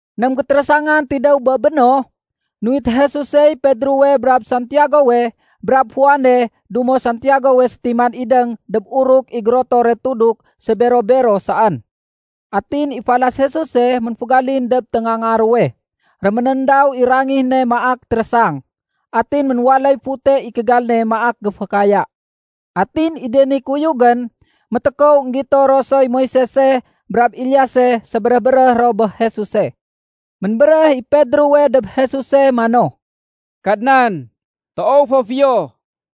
Ném gétérésangan tidéw bé béno, nuwit Jesusey Pedrowe brab Santiagowe brab Juane dumo Santiagowe sétiman idéng dob uruk i gérotore tuduk sébero-bero saén. Atin i falas Jesuse ménfégalin dob téngaanga ruwe. Réménéndaw i rangih ne maak térésang. Atin ménwaléy fute i kégal ne maak géfékaya. Atin i de ni kuyugén, métékow énggito ro soy Moisese brab Eliase sébéréh-béréh ro bé Jesuse. Ménbéréh i Pedrowe dob Jesuse mano, “Kadnan, toow fo fiyo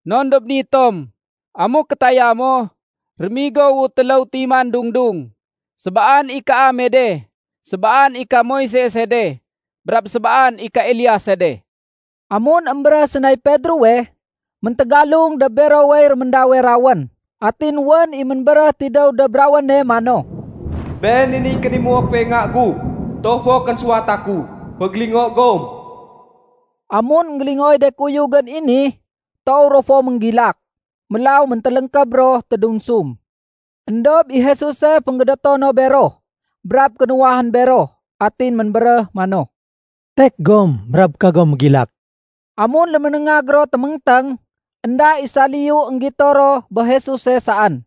non dob ni tom. Amuk kétaya mo, rémigowu téléw timan dung-dung. Sébaan i kaame de, sébaan i ka Moisese de, brab sébaan i ka Eliase de.” Amun émbéréh sénay Pedrowe, méntégalung dob berowey réméndawe rawén. Atin wén i ménbéréhe tidéw dob rawéne mano, “Been i niy kénimuo kuwe Nga gu, toow fo kénsuwata ku. Fégélingo gom.” Amun énggélingooy de kuyugén i ni, toow ro fo ménggilak. Mélaw méntéléngkéb ro tédunsum. Endob i Jesuse fénggédéto no bero brab kénuwahén bero. Atin ménbéréh mano, “Tek gom brab kagom mégilak.” Amun léménéngag ro téméngténg, énda i saliyu énggito ro bé Jesuse saén.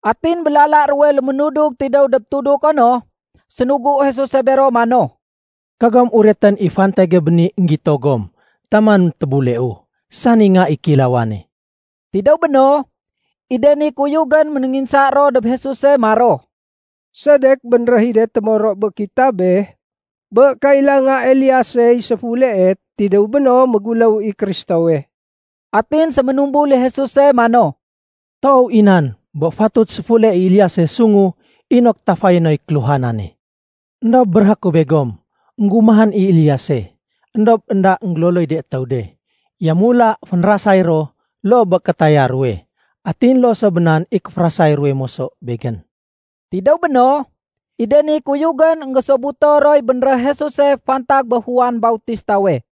Atin bé lala ruwe léménudug tidéw dob tuduko no, sénugu Jesuse bero mano, “Kagom uretén i fantage bé ni énggégito gom taman tébuleu, sani Nga i Kéilawane.” Tidéw béno, i de ni kuyugén ménénginsa ro dob Jesuse maro, “Sedek bénréh i de témoro bé kitabé bé kailanga Eliasey séfulee, tidéw béno méguléw i Kristowe?” Atin séménumbul i Jesuse mano, “Toow i nan bé fatut séfule i Eliase sungu inok tafayé noy kéluhanane. Endob béréhé ku begom, énggumahén i Eliase, éndob énda énggéloloy de étéw de. Yamula fénrasay ro loo bé kétaya ruwe. Atin loo so bé nan i kéférasay ruwe moso Begén.” Tidéw béno, i de ni kuyugén énggésobuto roy bénréh Jesuse fantag bé Juan Bautistawe.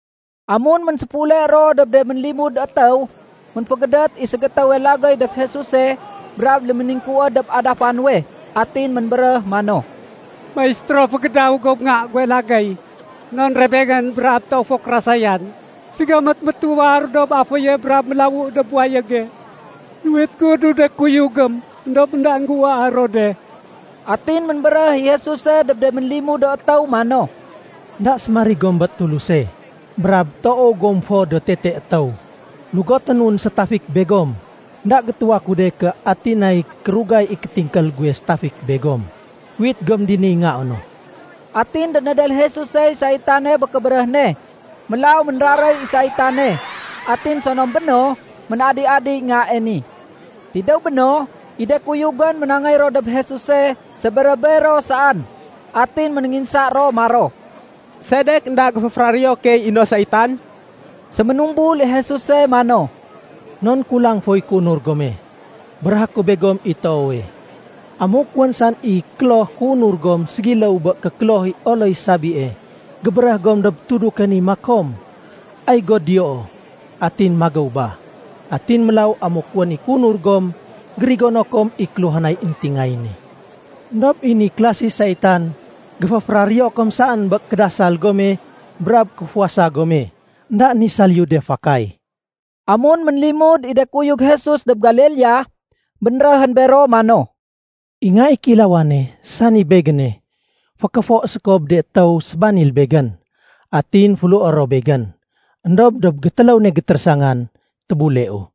Amun ménséfule ro dob de ménlimud étéw, ménfégédét i ségétéwe lagéy dob Jesuse brab léméningkuwéd dob adafa nuwe. Atin ménbéréh mano, “Maistéro, fégédaw go bé nga guwe lagéy. Non rebengén brab toow fo kérasayan. Ségamét métuwar dob aféye brab mélawu dob wayége. Nuwit gu dob de kuyugém, éndob énda géuwaa ro de.” Atin ménbéréh i Jesuse dob de ménlimud do étéw mano, “Enda sémarig gom bé Tuluse, brab toow gom fo do tete étéw. Lugoténun sétafik begom. Enda gétuwa ku de ké ati nay kérugay i kétingkél guwe sétafik begom. Uwit gom diniy ngao no.” Atin dénédél Jesusey saitane bé kébéréh ne. Mélaw ménraréy i saitane, atin sonom béno, ménadi-adiy ngae ni. Tidéw béno, i de kuyugén ménangéy ro dob Jesuse sébero-bero saén. Atin ménénginsa ro maro, “Sedek énda géféféraréyo key i no saitan?” Séménumbul i Jesuse mano, “Non kulang foy kéunur gome. Béréhé ku begom i toowe, amuk wén saén i kloh kéunur gom ségiléw bé kékloh i oloy sabie, gébéréh gom dob tuduke ni makom, ‘Ay go diyoo.’ Atin magéw ba. Atin mélaw amuk wén i kéunur gom, gérigono kom i kéluhanay éntingayéne. Endob i ni klasi saitan, géféféraréyo kom saén bé kédasal gome brab kéfuwasa gome. Endaén i saliyu de fakay.” Amun ménlimud i de kuyug Jesus dob Galilea, bénréhén bero mano, “I Nga i Kéilawane, sani Begéne, fékéfo séko bé de étéw sébanil Begén. Atin féléhué ro Begén. Endob dob gétéléw ne gétérésangan, tébuleu.”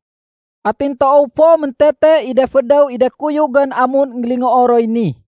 Atin toow fo méntete i de fédéw i de kuyugén amun énggélingoo roy ni.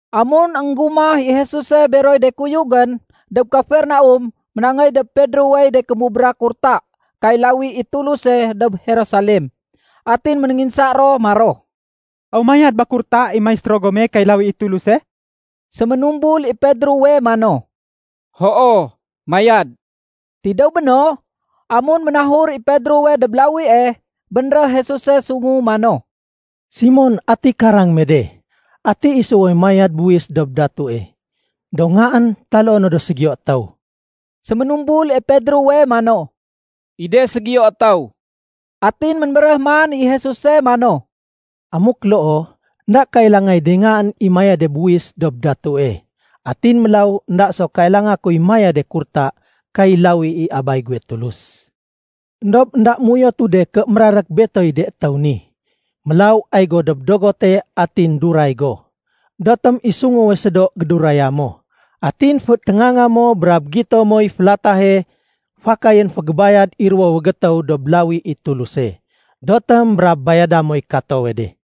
Amun énggumah i Jesuse beroy de kuyugén dob Kafernaum, ménangéy dob Pedrowey de kémubra kurta kay lawi i Tuluse dob Jerusalem. Atin ménénginsa ro maro, “Aw mayad ba kurta i Maistéro gome kay lawi i Tuluse?” Séménumbul i Pedrowe mano, “Hoo, mayad.” Tidéw béno, amun ménahur i Pedrowe dob lawie, bénréh Jesuse sungu mano, “Simon, ati karang me de? Ati isuwe mayad buwis dob datue, do ngaén taloo no do ségiyo étéw?” Séménumbul i Pedrowe mano, “I de ségiyo étéw.” Atin ménbéréh man i Jesuse mano, “Amuk loo, énda kailangay de ngaén i mayade buwis dob datue. Atin mélaw énda so kailanga kuy mayade kurta kay lawi i Abay guwe Tulus. Endob énda méuyotu de ké mérarék Betoy de étéw ni. Mélaw ay go dob dogote atin duray go. Edotém i sunguwe sédo géduraya mo. Atin féténganga mo brab gito moy félatahe fakayén fégébayad i ruwowe gétéw dob lawi i Tuluse. Dotém brab bayada moy katowe de.”